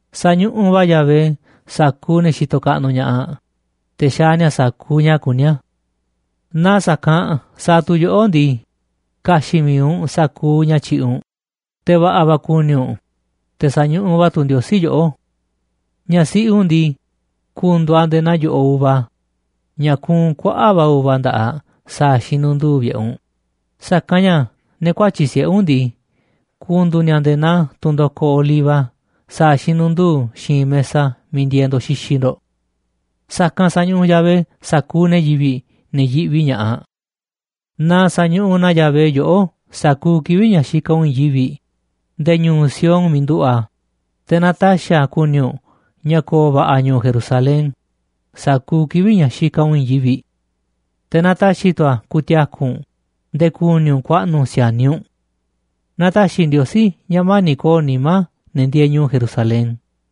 Sañuꞌuꞌ va̱ Yahvé sa̱kuuꞌ ne̱ xitoꞌ kaꞌnuꞌ ña̱ꞌaꞌ, te̱ xaaꞌ ni̱a̱ sa̱kuuꞌ ña̱ kuní a̱. Naaꞌ sa̱kanꞌ sa̱a̱ tu̱ yoꞌó ndii, ka̱xi̱ꞌ mi̱iꞌ u̱nꞌ sa̱kuuꞌ ña̱ tyi̱ꞌi̱ u̱nꞌ, te̱ va̱ꞌa̱ va̱ ku̱ni̱ u̱nꞌ, te̱ sa̱ñuꞌuꞌ va̱ tu̱ Ndiosí yoꞌó. Ñaꞌ siꞌi u̱nꞌ ndii, ku̱ndu̱u̱ aꞌ nde̱e̱ naa yo̱ꞌoꞌ uva ña̱ kuunꞌ kuaꞌa̱ꞌ va̱ uva nda̱ꞌaꞌ sa̱a̱ xinundu̱u̱ vi̱ꞌe̱ u̱nꞌ, sa̱kanꞌ ña̱ ne̱ kuatyi̱ꞌ siꞌe̱ u̱nꞌ ndii, ku̱ndu̱u̱ ni̱a̱ nde̱e̱ naa tunꞌ ndokoꞌ oliva sa̱a̱ xinundu̱u̱ xiinꞌ mesa miiꞌ ndieeꞌ ndo̱ꞌ xixiꞌ ndo̱ꞌ. Sa̱kanꞌ sa̱ñuꞌuꞌ Yahvé sa̱kuuꞌ ne̱ yivi̱ꞌ, ne̱ yiꞌvi ña̱ꞌaꞌ. Na sa̱ñuꞌuꞌ na Yahvé yoꞌó sa̱kuuꞌ kivi̱ꞌ ña̱ xikaꞌ u̱nꞌ i̱i̱n yivi̱ꞌ nde̱e̱ ñu̱u̱ Sión miiꞌ nduꞌu̱ꞌ a̱, te̱ na ta̱xi̱ a̱ ku̱ni̱ u̱nꞌ ña̱ ko̱o̱ va̱ꞌa̱ ñu̱u̱ Jerusalén sa̱kuuꞌ kivi̱ꞌ ña̱ xikaꞌ u̱nꞌ i̱i̱n yivi̱ꞌ. Te̱ na ta̱xi̱ tu̱ a̱ ku̱ti̱a̱ku̱ u̱nꞌ nde̱e̱ ku̱ni̱ u̱nꞌ ku̱a̱ꞌnu̱ si̱a̱niꞌ u̱nꞌ. Na ta̱xi̱ Ndiosí ña̱ mani̱ꞌ ko̱o̱ nimá ne̱ ndieeꞌ ñu̱u̱ Jerusalén.